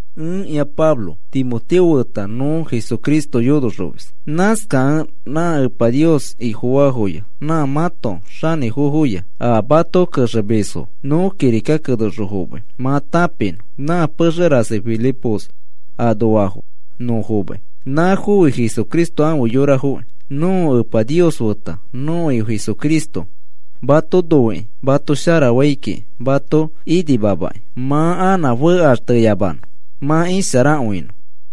Ẽkĩa Pablo, Timoteo feta nõ Jesucristo yonoxomis. Nãskakẽ nã Epa Nios Ifofaafoya nã mãto xanĩfofoya a mato kexemisfo nõ kirika kenexõ fomai mã tãpinõ. Nã pexe rasi Filipos anoafo nõ fomai, nãfofi Jesucristo afe yorafoki. Nõko Epa Nios feta nõko Ifo Jesucristo mato noikĩ mato sharafai kiki mato inimamakĩ mã anã fekaxteyamanõ mã isharakõinõ.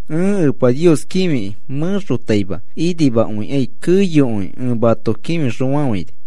Ẽ Epa Nios kĩfikĩ mẽxotaima inimakõikai keyokõi ẽ mato kĩfixõfafãini.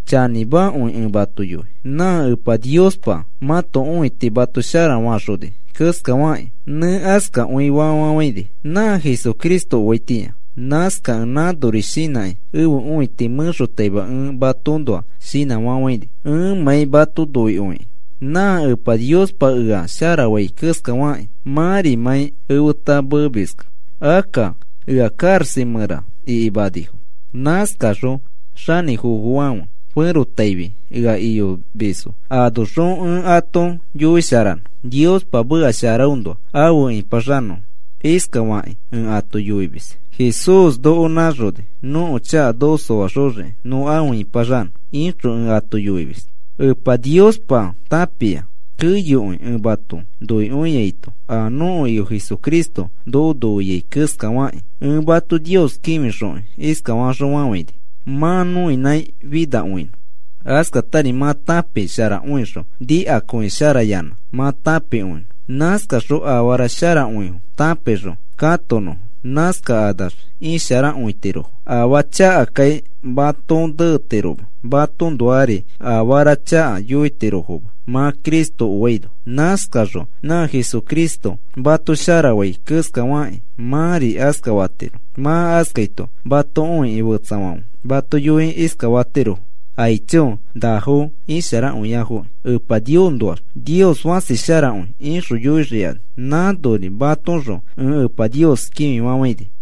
Chanĩmakõi ẽ yoi, nã Epa Niospa mãto õiti mato shara faxoni keskafakĩ nẽ askakõifa fafafãini nã Jesucristo oaitĩa. Nãskakẽ nãnori shinãkĩ ẽfe õiti mẽraxõ ẽ matoõnoa shinãfafãini, ẽmãi mato noikõikĩ nã Epa Niospa ea sharafai keskafakĩ mãrimãi efeta meemiskẽ. Akka ea karaxa mẽra ikimanifo. Nãskakaxõ xanĩfofofãfe ferotaifi ea iyomisfo anoxõ ẽ ato yoisharanõ Niospa meka sharaõnoa afe ĩpaxanõfo. Iskafakĩ ẽ ato yoimis: “Jesús noko nãxoni nõko chaka noko soaxoxiki nõ afe ĩpaxanõ,” ixõ ẽ ato yoimis. Epa Niospa tãpia keyokõi ẽ mato noikõiaito a nõko Ifo Jesucristo noko noikõiai keskafakĩ. Ẽ mato Nios kĩfixokĩ iskafaxõfafãini, mã nõinãi finakõinõ, askatari mã tãpisharakõixõ nikakõisharayanã mã tãpikõinõ. Nãskaxõ afara sharakõifo tãpixõ katonõfo. Nãskakanax isharakõitirofo, afaa chakakai matoõ netiroma, matoõnoari afara chaka yoitirofoma mã Cristo oaino. Nãskaxõ nã Jesucristo mato sharafai keskafakĩ, mãri askafatiro. Mã askaito mato õikĩ fetsafãfe mato yoikĩ iskafatirofo: “Aicho, nafo isharakõiafo Epa Niosnoax. Nios fãsi sharakõi,” ixõ yoixikani. Nãnori matoõxõ ẽ Epa Nios kĩfifafãini.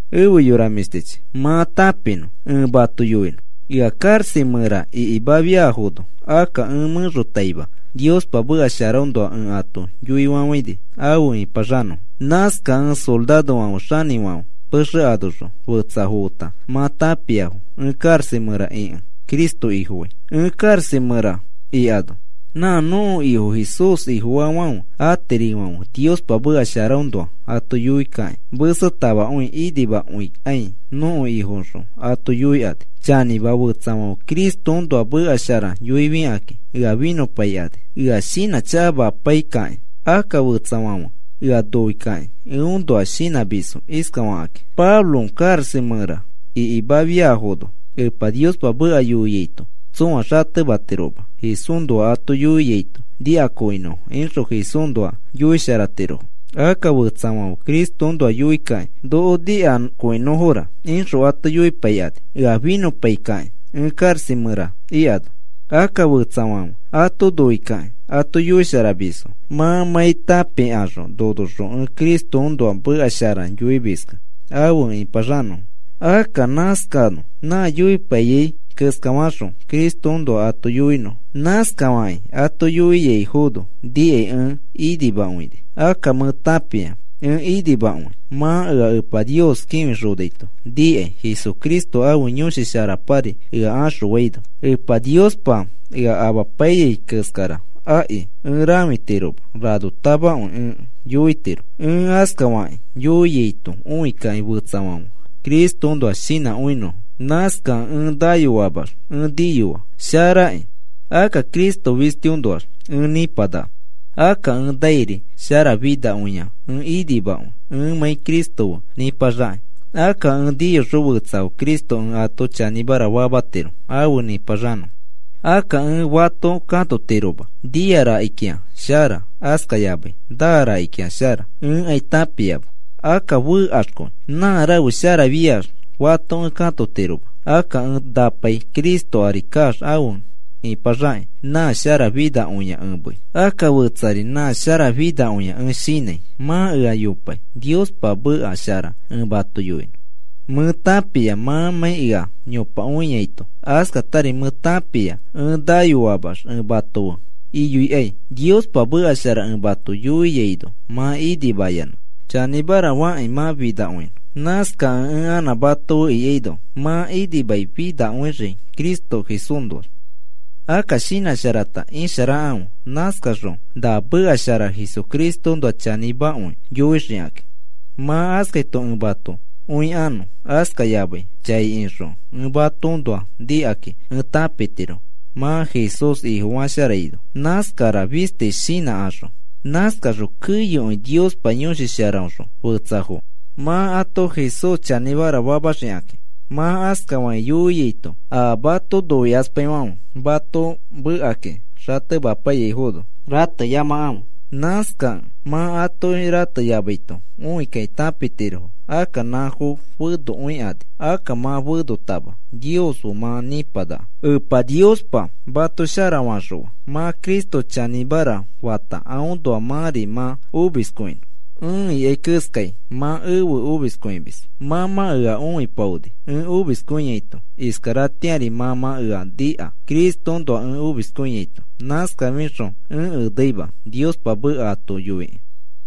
Efe yora mĩshtichi, mã tãpinõ ẽ mato yoinõ. Ea karaxa mẽra ikimafiafono, akka ẽ mẽxotaima Niospa meka sharaõnoa ẽ ato yoifafãini afe nĩpaxanõfo. Nãskakẽ sorarofãfe xanĩfãfe pexe anoxõ fetsafo feta mã tãpiafo ẽ karaxa mẽra ikẽ Cristo Ifofai. Ẽ karaxa mẽra ikano nã nõko Ifo Jesús Ifofaafãfe atirifãfe Niospa meka sharaõnoa ato yoikakĩ mesetamakõi inimakõikai nõko Ifoxõ ato yoikani. Chanĩma, fetsafãfe Cristoõnoa meka shara yoifikakĩ ea finõpaikani, ea shinãchakamapaikakĩ. Akka fetsafãfe ea noikakĩ eõnoa shinãmisfo iskafakakĩ: “Pablo karaxa mẽra ikimafiafono Epa Niospa meka yoiaito tsõa xatematiroma Jesúsnoa ato yoiaito nikakõinõfo,” ixõ Jesúsnoa yoisharatirofo. Akka fetsafãfe Cristoõnoa yoikakĩ: “Noko nikakõinõfora,” ixõ ato yoipaikani ea finõpaikakĩ ẽ karaxa mẽra ikano. Akka fetsafãfe ato noikakĩ ato yoisharamisfo, mãmãi tãpikaxõ nonoxõ ẽ Cristoõnoa meka shara yoimiskẽ afe nĩpaxanõfo. Akka nãskanõ, nã yoipaiyai keskafaxõ Cristoõnoa ato yoinõfo. Nãskafakĩ ato yoiaifono nikai ẽ inimakõini. Akka mẽ tãpia ẽ inimakõi, mã ea Epa Nios kĩfixonaito nikai Jesucristo ãfe Yõshi Sharapari ea axõfaino. Epa Niospa ea amapaiyai keskara akiki ẽ rãfitiroma. Ranotamakõi ẽ yoitiro. Ẽ askafakĩ yoiaito õikakĩ fetsafãfe Cristoõnoa shinãkõinõfo. Nãskakẽ ẽ nayoamax ẽ niyoa sharakĩ. Akka Cristo fistiõnoax ẽ ĩpanaka, akka ẽ nairi sharafinakõia, ẽ inimakõi ẽmãi Cristo fe nĩpaxakĩ. Akka ẽ niyoxõ fetsafo Cristo ẽ ato chanĩmara famatiro afe nĩpaxanõfo. Akka ẽ fato katotiroma, nia rakikĩa shara, askayamai naa rakikĩa shara. Ẽkai tãpiama. Akka fekaxkõi. Nã rafe sharafiax fato ẽ katotiroma. Akka ẽ napai Cristo ari kaax afe ĩpaxakĩ, nã sharafinakõia ẽ mei. Akka fetsari nã sharafinakõia ẽ shinãi, mã ea yopai Niospa meka shara ẽ mato yoinõ. Mẽ tãpia mãmãi ea yopakõiaito, askatari mẽ tãpia ẽ nayoamax ẽ mato fe iyoikai. Niospa meka shara ẽ mato yoiaino mã inimayanã chanĩmara fakĩ mã finakõinõ. Nãskakẽ ẽ anã mato fe ikaino mã inimaifinakõixii Cristo Jesúsnoax. Akka shinãsharata isharakãfe. Nãskaxõ na meka shara Jesucristoõnoa chanĩmakõi yoixikakĩ. Mã askaito ẽ mato õikanõ, askayamai chai ixõ ẽ matoõnoa nikakĩ ẽ tãpitiro mã Jesús Ifofasharaino nãskara fisti shinãkaxõ. Nãskaxõ keyokõi Niospa Yõshi Sharaõxõ fetsafo mã ato Jesús chanĩmara famaxikãki. Mã askafakĩ yoiaito a mato noikaspaifãfe mato mekakĩ xatemapaiyaifono rateyamakãfe. Nãskakẽ mã atoki rateyamaito õikakĩ tãpitirofo akka nãfo fenokõikani, akka mã fenotama Nios fe mã nĩpanaka. Epa Niospa mato sharafaxõa mã Cristo chanĩmara fata aõnoa mãri mã omiskõinõ. Ẽ ikai keskai mã efe omiskõimis. Mã mã ea õipaoni ẽ omiskõiaito, iskaratĩari mã mã ea nika Cristoõnoa ẽ omiskõiaito nãskafixõ ẽ eneima Niospa meka ato yoikĩ.